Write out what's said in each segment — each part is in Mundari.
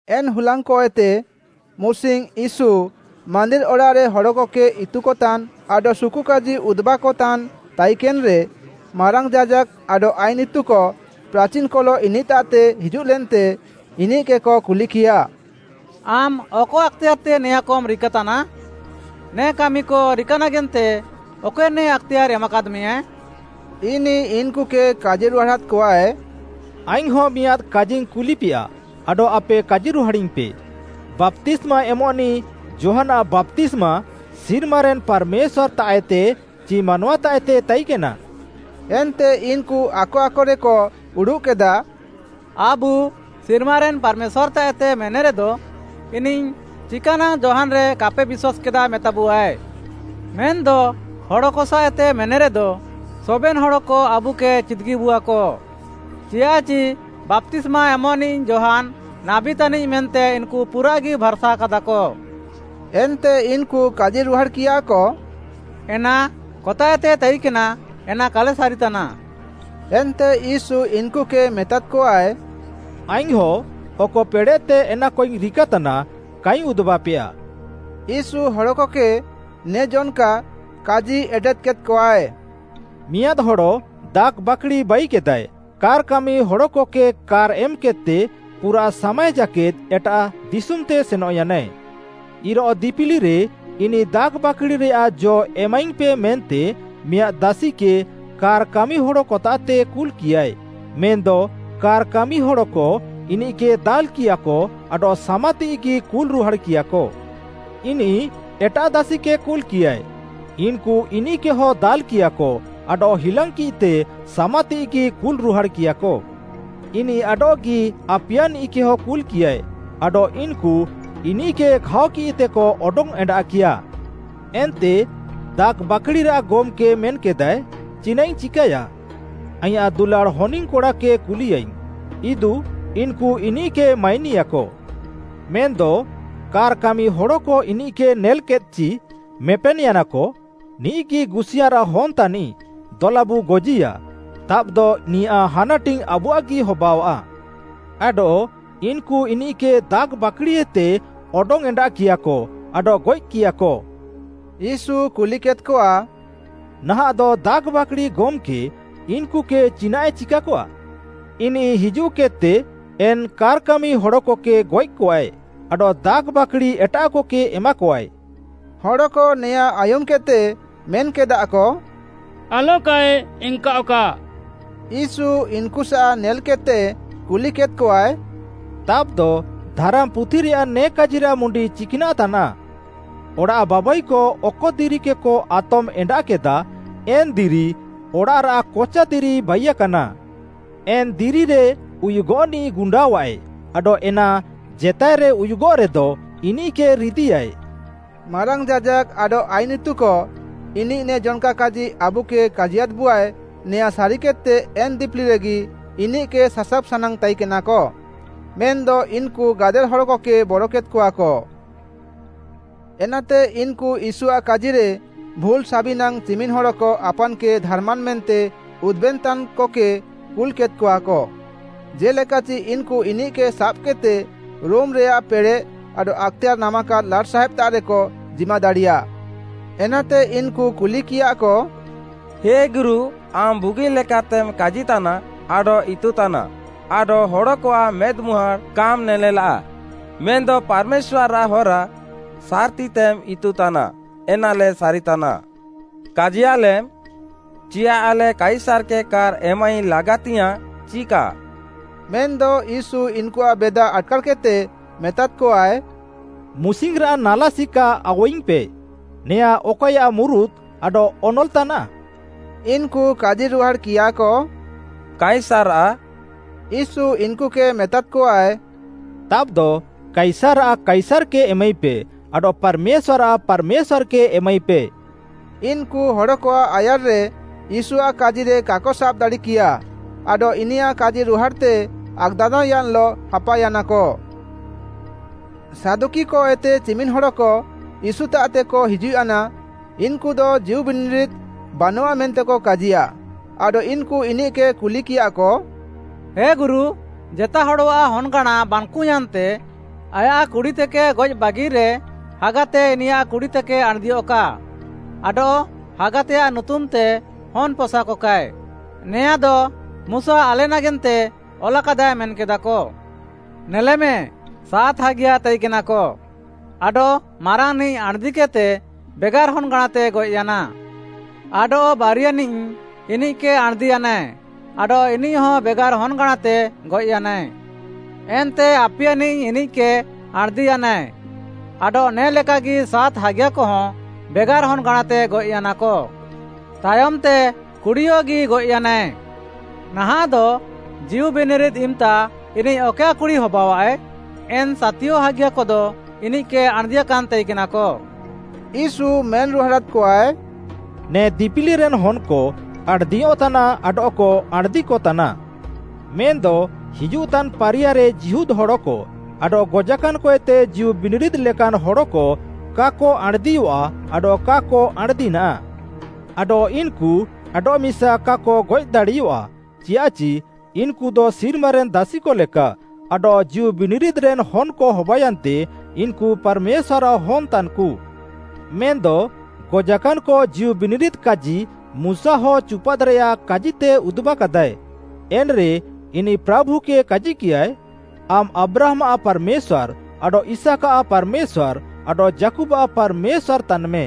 ଏନ୍‌ ହୁଲାଙ୍ଗ୍‌କଏତେ ମୁସିଙ୍ଗ୍‌ ୟୀଶୁ ମାନ୍ଦିର୍‌ ଅଡ଼ାଃରେ ହଡ଼କକେ ଇତୁକତାନ୍‌ ଆଡଃ ସୁକୁକାଜି ଉଦୁବାକତାନ୍‌ ତାଇକେନ୍‌ରେ ମାରାଙ୍ଗ୍‌ ଯାଜାକ୍‌କ ଆଡଃ ଆଇନ୍‌ ଇତୁକ ପ୍ରାଚିନ୍‌କଲଃ ଇନିଃତାଃତେ ହିଜୁଃଲେନ୍ତେ, ଇନିଃକେକ କୁଲିକିୟାଃ, “ଆମ୍‌ ଅକ ଆକ୍‌ତେୟାର୍‌ତେ ନେଆଁଁକମ୍‌ ରିକାତାନା? ନେ କାମିକ ରିକାନାଗେନ୍ତେ ଅକଏ ନେ ଆକ୍‌ତେୟାର୍‌ ଏମାକାଦ୍‌ମେଆ?” ଇନିଃ ଇନ୍‌କୁକେ କାଜିରୁହାଡ଼ାଦ୍‌କଆଏ, “ଆଇଙ୍ଗ୍‌ହଁ ମିଆଁଦ୍‌ କାଜିଙ୍ଗ୍‌ କୁଲିପେୟା, ଆଡଃ ଆପେ କାଜିରୁହାଡ଼ିଙ୍ଗ୍‌ପେ, ବାପ୍ତିସ୍ମା ଏମଃନିଃ ଯୋହାନ୍‌ଆଃ ବାପ୍ତିସ୍ମା ସିର୍ମାରେନ୍‌ ପାର୍‌ମେଶ୍ୱାର୍‌ତାଃଏତେ ଚି ମାନୱାତାଃଏତେ ତାଇକେନା?” ଏନ୍ତେ ଇନ୍‌କୁ ଆକ ଆକରେକ ଉଡ଼ୁଃକେଦା, “ଆବୁ, ‘ସିର୍ମାରେନ୍‌ ପାର୍‌ମେଶ୍ୱାର୍‌ତାଃଏତେ’ ମେନେରେଦ ଇନିଃ ‘ଚିକାନାଙ୍ଗ୍‌ ଯୋହାନ୍‌ରେ କାପେ ବିଶ୍ୱାସ୍‌କେଦା’ ମେତାବୁଆଏ? ମେନ୍‌ଦ ହଡ଼କ ସାଃଏତେ ମେନେରେଦ ସବେନ୍‌ ହଡ଼କ ଆବୁକେ ଚିଦ୍‌ଗିବୁଆକ, ଚିୟାଃଚି ବାପ୍ତିସ୍ମା ଏମଃନିଃ ଯୋହାନ୍‌ ନାବୀ ତାନିଃ ମେନ୍ତେ ଇନ୍‌କୁ ପୁରାଃଗି ଭାର୍‌ସାକାଦାକ।” ଏନ୍ତେ ଇନ୍‌କୁ କାଜିରୁହାଡ଼୍‌କିୟାକ, “ଏନା କତାଃଏତେ ତାଇକେନା ଏନା କାଲେ ସାରିତାନା।” ଏନ୍ତେ ୟୀଶୁ ଇନ୍‌କୁକେ ମେତାଦ୍‌କଆଏ, “ଆଇଙ୍ଗ୍‌ହଁ ଅକ ପେଡ଼େଃତେ ଏନାକଇଙ୍ଗ୍‌ ରିକାତାନା, କାଇଙ୍ଗ୍‌ ଉଦୁବାପେୟା।” ୟୀଶୁ ହଡ଼କକେ ନେ ଜନ୍‌କା କାଜି ଏଟେଦ୍‌କେଦ୍‌ଆଏ, “ମିଆଁଦ୍‌ ହଡ଼ ଦାଖ୍‌ବାକ୍‌ଡ଼ି ବାଇକେଦାଏ, କାର୍‌କାମିହଡ଼କକେ କାର୍‌ ଏମ୍‌କେଦ୍‌ତେ ପୁରାଃ ସାମାଏ ଜାକେଦ୍‌ ଏଟାଃ ଦିଶୁମ୍‌ତେ ସେନଃୟାନାଏ। ଇରୋଃଅ ଦିପିଲିରେ ଇନିଃ ଦାଖ୍‌ବାକ୍‌ଡ଼ିରେୟାଃ ଜ ଏମାଇଙ୍ଗ୍‌ପେ ମେନ୍ତେ ମିଆଁଦ୍‌ ଦାସିକେ କାର୍‌ କାମିହଡ଼କତାଃତେ କୁଲ୍‌କିୟାଏ, ମେନ୍‌ଦ କାର୍‌କାମିହଡ଼କ ଇନିଃକେ ଦାଲ୍‌କିୟାଃକ ଆଡଃ ସାମାତିଃଇଗି କୁଲ୍‌ରୁହାଡ଼୍‌କିୟାଃକ। ଇନିଃ ଏଟାଃ ଦାସିକେ କୁଲ୍‌କିୟାଏ, ଇନ୍‌କୁ ଇନିଃକେହ ଦାଲ୍‌କିୟାଃକ ଆଡଃ ହିଲାଙ୍ଗ୍‌କିଦ୍‌ତେ ସାମାତିଃଇଗି କୁଲ୍‌ରୁହାଡ଼୍‌କିୟାଃକ। ଇନିଃ ଆଡଃଗି ଆପିୟାନିଃକେହ କୁଲ୍‌କିୟାଏ, ଆଡଃ ଇନ୍‌କୁ ଇନିଃକେ ଘାଅକିଃତେକ ଅଡଙ୍ଗ୍‌ଏଣ୍ଡାଃକିୟାଃ। ଏନ୍ତେ ଦାଖ୍‌ବାକ୍‌ଡ଼ିରାଃ ଗମ୍‌କେ ମେନ୍‌କେଦାଏ, ‘ଚିନାଃଇଙ୍ଗ୍‌ ଚିକାୟା? ଆଇଁୟାଃ ଦୁଲାଡ଼୍‌ ହନିଙ୍ଗ୍‌କଡ଼ାକେ କୁଲିୟାଇଙ୍ଗ୍‌, ଇଦୁ ଇନ୍‌କୁ ଇନିଃକେ ମାଇନିୟାକ।’ ମେନ୍‌ଦ କାର୍‌କାମିହଡ଼କ ଇନିଃକେ ନେଲ୍‌କିଦ୍‌ଚି ମେପେନ୍‌ୟାନାକ, ‘ନିଃଗି ଗୁସିୟାଁରାଃ ହନ୍‌ ତାନିଃ ଦଲାବୁ ଗଜିୟା, ତାବ୍‌ଦ ନିୟାଃ ହାନାଟିଙ୍ଗ୍‌ ଆବୁଆଃଗି ହବାଅଆଃ।’ ଆଡଃ ଇନ୍‌କୁ ଇନିଃକେ ଦାଖ୍‌ବାକ୍‌ଡ଼ିଏତେ ଅଡଙ୍ଗ୍‌ଏଣ୍ଡାଃକିୟାଃକ ଆଡଃ ଗଏଃକିୟାଃକ। “ୟୀଶୁ କୁଲିକେଦ୍‌କଆ, ‘ନାହାଁଃଦ ଦାଖ୍‌ବାକ୍‌ଡ଼ି ଗମ୍‌କେ ଇନ୍‌କୁକେ ଚିକ୍‌ନାଃଏ ଚିକାକଆ? ଇନିଃ ହିଜୁଃକେଦ୍‌ତେ ଏନ୍‌ କାର୍‌କାମିହଡ଼କକେ ଗଏଃକଆଏ ଆଡଃ ଦାଖ୍‌ବାକ୍‌ଡ଼ି ଏଟାଃକକେ ଏମାକଆଏ।’” ହଡ଼କ ନେଆଁଁ ଆୟୁମ୍‌କେଦ୍‌ତେ ମେନ୍‌କେଦାଃକ, “ଆଲକାଏ ଏନ୍‌କାଅଃକା।” ୟୀଶୁ ଇନ୍‌କୁସାଃ ନେଲ୍‌କେଦ୍‌ତେ କୁଲିକେଦ୍‌କଆଏ, “ତାବ୍‌ଦ ଧାରାମ୍‌ପୁଥିରେୟାଃ ନେ କାଜିରାଃ ମୁଣ୍ଡି ଚିକ୍‌ନାଃ ତାନାଃ?” “‘ଅଡ଼ାଃ ବାବାଇକ ଅକ ଦିରିକେକ ଆତମ୍‌ ଏଣ୍ଡାଃକେଦା, ଏନ୍‌ ଦିରି ଅଡ଼ାଃରାଃ କଚାଦିରି ବାଇୟାକାନା।’ ଏନ୍‌ ଦିରିରେ ଉୟୁଗଃନିଃ ଗୁଣ୍ଡାଅଃଆଏ ଆଡଃ ଏନା ଜେତାଏରେ ଉୟୁଗଃରେଦ ଇନିଃକେ ରିଦିୟାଏ।” ମାରାଙ୍ଗ୍‌ ଯାଜାକ୍‌କ ଆଡଃ ଆଇନ୍‌ ଇତୁକ ଇନିଃ ନେ ଜନ୍‌କା କାଜି ଆବୁକେ କାଜିୟାଦ୍‌ବୁଆଏ ନେଆଁଁ ସାରିକେଦ୍‌ତେ ଏନ୍‌ ଦିପିଲିରେଗି ଇନିଃକେ ସାସାବ୍ ସାନାଙ୍ଗ୍‌ ତାଇକେନାକ, ମେନ୍‌ଦ ଇନ୍‌କୁ ଗାଦେଲ୍ ହଡ଼କକେ ବରକେଦ୍‌କଆକ। ଏନାତେ ଇନ୍‌କୁ ୟୀଶୁଆଃ କାଜିରେ ଭୁଲ୍‌ ସାବିନାଙ୍ଗ୍‌ ଚିମିନ୍‌ ହଡ଼କ ଆପାନ୍‌କେ ଧାର୍‌ମାନ୍‌ ମେନ୍ତେ ଉଦୁବେନ୍‌ତାନ୍‌କକେ କୁଲ୍‌କେଦ୍‌କଆକ, ଜେ'ଲେକାଚି ଇନ୍‌କୁ ଇନିଃକେ ସାବ୍‌କେଦ୍‌ତେ ରୋମ୍‌ରେୟାଃ ପେଡ଼େଃ ଆଡଃ ଆକ୍‌ତେୟାର୍‌ ନାମାକାଦ୍‌ ଲାଟ୍‌ସାହେବ୍‌ତାଃରେକ ଜିମାଦାଡ଼ିୟା। ଏନାତେ ଇନ୍‌କୁ କୁଲିକିୟାଃକ, “ହେ ଗୁରୁ, ଆମ୍‌ ବୁଗିଲେକାତେମ୍‌ କାଜିତାନା ଆଡଃ ଇତୁତାନା ଆଡଃ ହଡ଼କଆଃ ମେଦ୍‌ମୁହାଁଡ଼୍‌ କାମ୍‌ ନେନେଲାଃ, ମେନ୍‌ଦ ପାର୍‌ମେଶ୍ୱାର୍‌ରାଃ ହରା ସାର୍‌ତିତେମ୍‌ ଇତୁତାନା, ଏନାଲେ ସାରିତାନା। କାଜିୟାଲେମ୍‌, ଚିୟାଃ ଆଲେ କାଇସାର୍‌କେ କାର୍‌ ଏମାଇ ଲାଗାତିଙ୍ଗ୍‌ୟାଁଃ ଚି କା?” ମେନ୍‌ଦ ୟୀଶୁ ଇନ୍‌କୁଆଃ ବେଦା ଆଟ୍‌କାର୍‌କେଦ୍‌ତେ ମେତାଦ୍‌କଆଏ, “ମୁସିଙ୍ଗ୍‌ରାଃ ନାଲା ସିକା ଆଉୱାଇଙ୍ଗ୍‌ପେ, ନେଆଁଁ ଅକଏୟାଃ ମୁରୁତ୍‌ ଆଡଃ ଅନଲ୍‌ ତାନାଃ?” ଇନ୍‌କୁ କାଜିରୁହାଡ଼୍‌କିୟାକ, “କାଇସାର୍‌ଆଃ।” ୟୀଶୁ ଇନ୍‌କୁକେ ମେତାଦ୍‌କଆଏ, “ତାବ୍‌ଦ କାଇସାର୍‌ଆଃ କାଇସାର୍‌କେ ଏମାଇପେ, ଆଡଃ ପାର୍‌ମେଶ୍ୱାର୍‌ଆଃ ପାର୍‌ମେଶ୍ୱାର୍‌କେ ଏମାଇପେ।” ଇନ୍‌କୁ ହଡ଼କଆଃ ଆୟାର୍‌ରେ ୟୀଶୁଆଃ କାଜିରେ କାକ ସାବ୍‌ ଦାଡ଼ିକିୟାଃ, ଆଡଃ ଇନିୟାଃ କାଜିରୁହାଡ଼୍‌ତେ ଆକ୍‌ଦାନ୍ଦାଅୟାନ୍‌ଲଃ ହାପାୟାନାକ। ସାଦୁକିକଏତେ ଚିମିନ୍‌ହଡ଼କ ୟୀଶୁତାଃତେକ ହିଜୁଃୟାନା, ଇନ୍‌କୁଦ ଜୀଉବିନିରିଦ୍‌ ବାନଃଆମେନ୍ତେକ କାଜିୟା, ଆଡଃ ଇନ୍‌କୁ ଇନିଃକେ କୁଲିକିୟାଃକ, “ହେ ଗୁରୁ, ଜେତାଏ ହଡ଼ଆଃ ହନ୍‌ଗାଁଣା ବାନ୍‌କୁୟାନ୍ତେ ଆୟାଃ କୁଡ଼ିତେକେ ଗଏଃବାଗିରେ ହାଗାତେ ଇନିୟାଃ କୁଡ଼ିତେକେ ଆଣ୍‌ଦିୟଃକା ଆଡଃ ହାଗାତେୟାଃ ନୁତୁମ୍‌ତେ ହନ୍‌ ପସାକକାଏ, ନେଆଁଦ ମୁଶା ଆଲେ ନାଗେନ୍ତେ ଅଲାକାଦାଏ ମେନ୍‌କେଦାକ। ନେଲେମେ ସାତ୍‌ ହାଗିୟା ତାଇକେନାକ, ଆଡଃ ମାରାଙ୍ଗ୍‌ନିଃ ଆଣ୍‍ଦିକେଦ୍‍ତେ ବେଗାର୍‌ ହନ୍‌ଗାଁଣାତେ ଗଏଃୟାନାଏ। ଆଡଃ ବାରିୟାନିଃ ଇନିଃକେ ଆଣ୍‌ଦିୟାନାଏ ଆଡଃ ଇନିଃହ ବେଗାର୍‌ ହନ୍‌ଗାଁଣାତେ ଗଏଃୟାନାଏ। ଏନ୍ତେ ଆପିୟାନିଃ ଇନିଃକେ ଆଣ୍‌ଦିୟାନାଏ ଆଡଃ ନେ ଲେକାଗି ସାତ୍‌ ହାଗିୟାକହଁ ବେଗାର୍‌ ହନ୍‌ଗାଁଣାତେ ଗଏଃୟାନାକ। ତାୟମ୍‌ତେ, କୁଡ଼ିୟଗି ଗଏଃୟାନାଏ। ନାହାଁଃଦ ଜୀଉବିନିରିଦ୍‌ ଇମ୍‌ତା ଇନିଃ ଅକଏୟାଃ କୁଡ଼ି ହବାଅଆଃଏ? ଏନ୍‌ ସାତିୟ ହାଗିୟାକଦ ଇନିଃକେ ଆଣ୍‌ଦିୟାକାନ୍‌ ତାଇକେନାକ।” ୟୀଶୁ ମେନ୍‌ରୁହାଡ଼ାଦ୍‌କଆଏ, “ନେ ଦିପିଲିରେନ୍‌ ହନ୍‌କ ଆଣ୍‌ଦିୟଃତାନା ଆଡଃକ ଆଣ୍‌ଦିକତାନା। ମେନ୍‌ଦ ହିଜୁଃତାନ୍‌ ପାରିୟାରେ ଜୀହୁଦଃ ହଡ଼କ ଆଡଃ ଗଜାକାନ୍‌କଏତେ ଜୀଉବିନିରିଦ୍‌ଲେକାନ୍‌ ହଡ଼କ କାକ ଆଣ୍‌ଦିୟଃଆ ଆଡଃ କାକ ଆଣ୍‌ଦିନାଃ। ଆଡଃ ଇନ୍‌କୁ ଆଡଃମିସା କାକ ଗଏଃଦାଡ଼ିୟଃଆ, ଚିୟାଃଚି ଇନ୍‌କୁଦ ସିର୍ମାରେନ୍‌ ଦାସିକଲେକା, ଆଡଃ ଜୀଉବିନିରିଦ୍‌ରେନ୍‌ ହନ୍‌କ ହବାୟାନ୍ତେ ଇନ୍‌କୁ ପାର୍‌ମେଶ୍ୱାର୍‌ଆଃ ହନ୍‌ ତାନ୍‌କୁ। ମେନ୍‌ଦ ଗଜାକାନ୍‌କ ଜୀଉବିନିରିଦ୍‌ କାଜି ମୁଶାହଁ ଚୁପାଦ୍‌ରେୟାଃ କାଜିତେ ଉଦୁବାକାଦାଏ, ଏନ୍‌ରେ ଇନିଃ ପ୍ରାଭୁକେ କାଜିକିୟାଏ, ‘ଆମ୍‌ ଆବ୍ରାହାମ୍‌ଆଃ ପାର୍‌ମେଶ୍ୱାର୍‌, ଆଡଃ ଇସାକ୍‌ଆଃ ପାର୍‌ମେଶ୍ୱାର୍‌, ଆଡଃ ଯାକୁବ୍‌ଆଃ ପାର୍‌ମେଶ୍ୱାର୍‌ ତାନ୍‌ମେ।’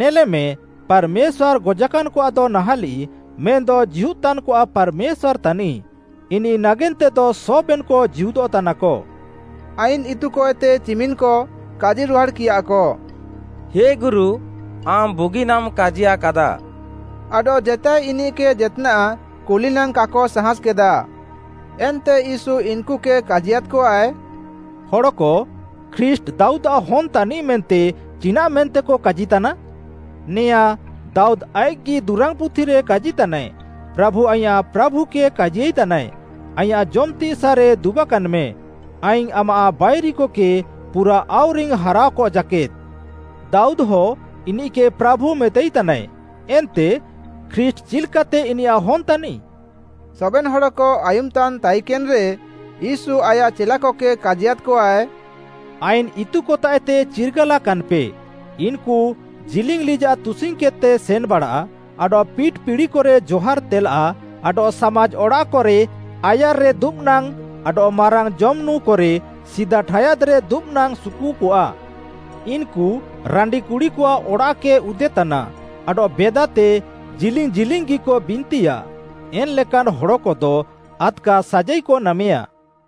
ନେଲେମେ ପାର୍‌ମେଶ୍ୱାର୍‌ ଗଜାକାନ୍‌କଆଃଦ ନାହାଁଲିଃ, ମେନ୍‌ଦ ଜୀହୁଦ୍‌ତାନ୍‌କଆଃ ପାର୍‌ମେଶ୍ୱାର୍‌ ତାନିଃ, ଇନିଃ ନାଗେନ୍ତେଦ ସବେନ୍‌କ ଜୀହୁଦଃତାନାକ।” ଆଇନ୍‌ ଇତୁକଏତେ ଚିମିନ୍‌କ କାଜିରୁହାଡ଼୍‌କିୟାକ, “ହେ ଗୁରୁ ଆମ୍‌ ବୁଗିନାମ୍‌ କାଜିୟାକାଦାଃ।” ଆଡଃ ଜେତାଏ ଇନିଃକେ ଜେତ୍‌ନାଃ କୁଲିନାଙ୍ଗ୍‌ କାକ ସାହାଁସ୍‌କେଦା। ଏନ୍ତେ ୟୀଶୁ ଇନ୍‌କୁକେ କାଜିୟାଦ୍‌କଆଏ, “ହଡ଼କ ଖ୍ରୀଷ୍ଟ୍‌ ଦାଉଦ୍‌ଆଃ ହନ୍‌ ତାନିଃ ମେନ୍ତେ ଚିନାଃମେନ୍ତେକ କାଜିତାନା?” ନେଆଁଁ ଦାଉଦ୍‌ ଆଇଃକ୍‌ଗି ଦୁରାଙ୍ଗ୍‌ ପୁଥିରେ କାଜିତାନାଏ, “‘ପ୍ରାଭୁ ଆଇଁୟାଃ ପ୍ରାଭୁକେ କାଜିୟାଇତାନାଏ, ଆଇଁୟାଃ ଜମ୍‌ତିଃ ସାଃରେ ଦୁବାକାନ୍‌ମେଁ, ଆଇଙ୍ଗ୍‌ ଆମାଃ ବାଇରିକକେ ପୁରା ଆଉରିଙ୍ଗ୍‌ ହାରାଅକ ଜାକେଦ୍‌।’” “ଦାଉଦ୍‌ଦଃ ଇନିଃକେ ‘ପ୍ରାଭୁ’ ମେତାଇତାନାଏ, ଏନ୍ତେ ଖ୍ରୀଷ୍ଟ୍‌ ଚିଲ୍‌କାତେ ଇନିୟାଃ ହନ୍‌ ତାନିଃ?” ସବେନ୍‌ ହଡ଼କ ଆୟୁମ୍‌ତାନ୍‌ ତାଇକେନ୍‌ରେ, ୟୀଶୁ ଆୟାଃ ଚେଲାକକେ କାଜିୟାଦ୍‌କଆଏ, “ଆଇନ୍‌ ଇତୁକତାଃଏତେ ଚିର୍ଗାଲାକାନ୍‌ପେ, ଇନ୍‌କୁ ଜିଲିଙ୍ଗ୍‌ ଲିଜାଃ ତୁସିଙ୍ଗ୍‌କେଦ୍‌ତେ ସେନ୍‌ବାଡ଼ା, ଆଡଃ ପିଟ୍‌ ପିଡ଼ିକରେ ଜହାର୍‌ତେଲା ଆଡଃ ସାମାଜ୍‌ ଅଡ଼ାଃକରେ ଆୟାର୍‌ରେ ଦୁବ୍‌ନାଙ୍ଗ୍‌ ଆଡଃ ମାରାଙ୍ଗ୍‌ ଜମ୍‌ନୁଁକରେ ସିଦା ଠାୟାଦ୍‌ରେ ଦୁବ୍‌ନାଙ୍ଗ୍‌ ସୁକୁକଆ। ଇନ୍‌କୁ ରାଣ୍ଡିକୁଡ଼ିକଆଃ ଅଡ଼ାଃକ ଉଦେତାନା ଆଡଃ ବେଦାତେ ଜିଲିଙ୍ଗ୍‌ ଜିଲିଙ୍ଗ୍‌ଗିକ ବିନ୍ତିୟା। ଏନ୍‌ଲେକାନ୍‌ ହଡ଼କଦ ଆଦ୍‌କା ସାଜାଇକ ନାମେୟା।”